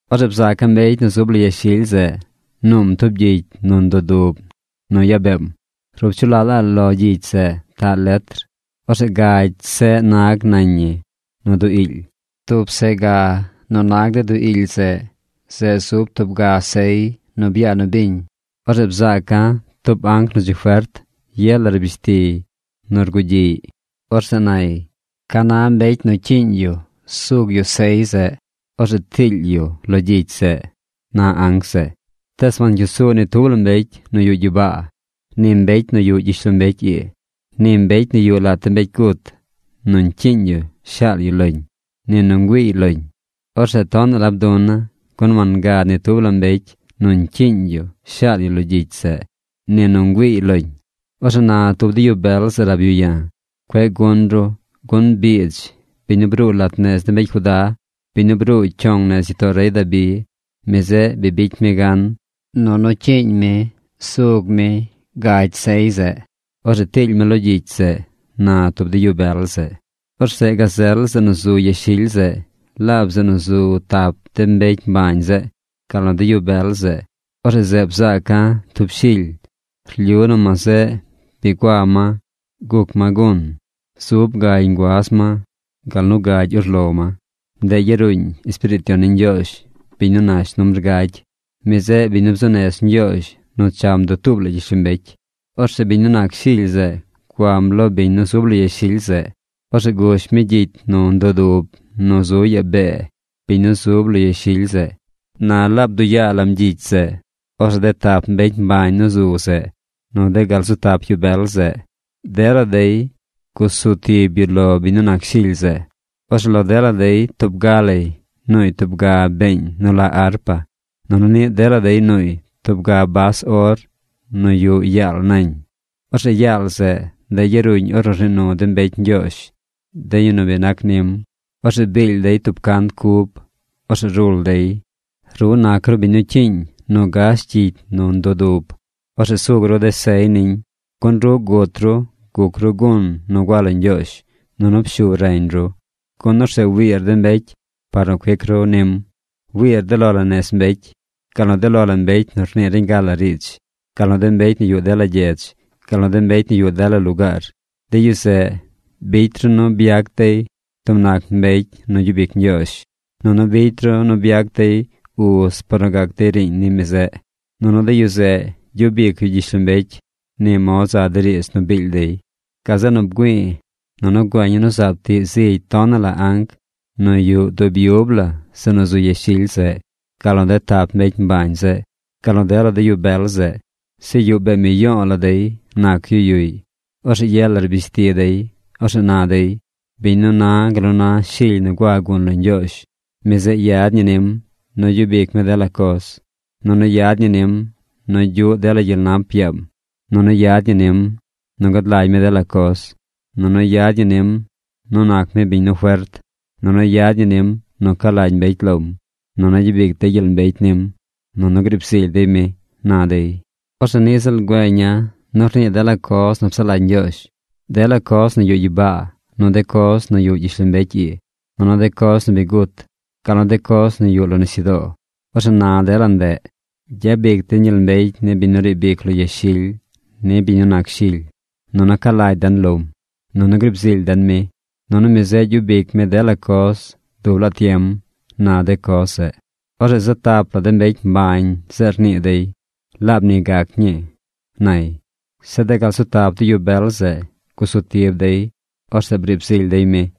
Orzeꞌ bzaaca̱ mbecy nu zub lo yashily zeꞌ nuum tub gyicy nu ndudub nu yaa beem. Rup chu laꞌ la lo gyicy zeꞌ taꞌ letr. Orzeꞌ gagy seꞌ nag nañ ñi nu duu iily. Tub ga seꞌ nu nag de duu iily zeꞌ, zeꞌ zub tub ga sey nu byaa nu biñ. Orzeꞌ bzaaca̱ tub anc nu dzi fert. Ye la rbish tiy nu rgugyiꞌy: ―¿Ca na mbecy nu cyiiñ yu sug yu sey zeꞌ? Orzeꞌ tiily yu lo gyicy zeꞌ ―na anc zeꞌ. Tees wancyuu su ni tub la mbecy nu yuꞌ gyibaa, ni mbecy nu yuꞌ gyishlombecy ii, ni mbecy nu yuꞌ lat de mbecy gut nu ñcyiiñ yu shaal yu loñ, ni nu güiiy loñ. Orzeꞌ tonaꞌ la bduna̱, gun wangad ni tub la mbecy nu ñcyiiñ yu shaal yu lo gyicy zeꞌ, ni nu ngüiiy loñ. Orzeꞌ na tub de yu bel zeꞌ rab yu ya̱: ―Cueꞌ gun ru, gun biidz, biñ nu bruu lat nez de mbecy Judá, biñ nu bruu cyong nez gyitoo rey Dabi, mi zeꞌ bi bicy mi gan, nunu cyiiñ mi sug mi gagy sey zeꞌ. Orzeꞌ tiily mi lo gyicy zeꞌ ―na tub de yu bel zeꞌ. Orzeꞌ gazel zeꞌ nu zu yashily zeꞌ, laab zeꞌ nu zu tap de mbecy mbañ zeꞌ, gal nu de yu bel zeꞌ. Orzeꞌ zeꞌ bzaaca̱ tub Shily. Rlyu nu ma zeꞌ bi gua ma guc ma gun. Zub gagy nguaz ma, gal nu gagy urlo ma. Ndeꞌ yaruuñ Espiriit Yon ni Ñgyoozh, biñ nu nash numbr gagy. Mi zeꞌ biñ nu bzuu nez Ñgyoozh nu cham dutuub la gyishlombecy. Orzeꞌ biñ nu nac Shily zeꞌ guam lo biñ nu zub lo yashily zeꞌ. Orzeꞌ gush mi gyicy nu ndudub nu zu yaa bee biñ nu zub lo yashily zeꞌ. Na laab bduꞌ yaa lam gyicy zeꞌ, orzeꞌ de tap mbecy mbañ nu zu zeꞌ, nu de gal zu tap yu bel zeꞌ, dela dey gusu tib yu lo biñ nu nac Shily zeꞌ. Orzeꞌ lo dela dey tub ga lay nuuy tub ga been nu la arpa. Nunu niꞌ dela dey nuuy tub ga bas or nu yuꞌ yaal nañ. Orzeꞌ yaal zeꞌ, ndeꞌ yaruuñ ornu rnii nu de mbecy Ñgyoozh, de yu nu bi nac nim. Orzeꞌ biil dey tub cant cub. Orzeꞌ rul dey: Ru nac ru biñ nu cyiiñ nu gash gyicy nu ndudub. Orzeꞌ sug ru de sey niñ. Gun ru gut ru guc ru gun nu gua lo Ñgyoozh. Nunu pshu reñ ru. Gun orzeꞌ wiir de mbecy par nu cuic ru nim. Wiir de lo la nez mbecy, gal nu de lo la mbecy nu rnii reñ gal la riidz, gal nu de mbecy nu yuꞌ dela gyedz, gal nu de mbecy nu yuꞌ dela lugaar. De yu zeꞌ, bicy ru nu byac dey tub nac mbecy nu gyub ic Ñgyoozh. Nunu bicy ru nu byac dey uz par nu gac dey riiñ ni mi zeꞌ. Nunu de yu zeꞌ gyub ic yu gyishlombecy. Ni mod za de riidz nu biil dey. Gazeꞌ nu bgüi̱i̱ nunu güeña̱ nu zaab tiꞌ zigy tonaꞌ la anc nu yuꞌ dub yub la zeꞌ nu zu yashily zeꞌ, gal nu de tap mbecy mbañ zeꞌ, gal nu dela de yu bel zeꞌ. Zeꞌ yuꞌ bee miyo̱o̱ la dey nac yu yuꞌy. Orzeꞌ ye la rbish ti dey. Orzeꞌ na dey: Biñ nu na gal nu na Shily nu gua gun lo Ñgyoozh, mi zeꞌ yad ñi nim nu gyub ic mi dela coz, nunu yad ñi nim nu gyuꞌ dela gyel nap yaam, nunu yad ñi nim nu gad lagy mi dela coz, nunu yad ñi nim nu nac mi biñ nu fert, nunu yad ñi nim nu ca lagy mbecy lom, nunu gyabic dey gyel mbecy nim, nunu griib zily dey mi, na dey. Orzeꞌ niꞌ ziꞌl güeña̱ nu rnii dela coz nu psaꞌ lagy Ñgyoozh: dela coz nu yuꞌ gyibaa, nu de coz nu yuꞌ gyishlombecy ii, nunu de coz nu bi gut, gal nu de coz nu yuꞌ lo nisyudoo. Orzeꞌ na dela ndeꞌ: Gyabic den gyel mbecy ni biñ nu riib ic lo yashily, ni biñ nu nac Shily. Nunu ca lagy den lom, nunu grib zily den mi, nunu mi zeꞌ gyub ic mi dela coz dub laa tiem, na de coz zeꞌ. Orzeꞌ zaꞌ tap la de mbecy mbañ zeꞌ rnii dey: ―¡Laab ni gac ñii! ―nay. Zeꞌ de gal zu tap de yu bel zeꞌ gusu tib dey. Orzeꞌ briib zily dey mi.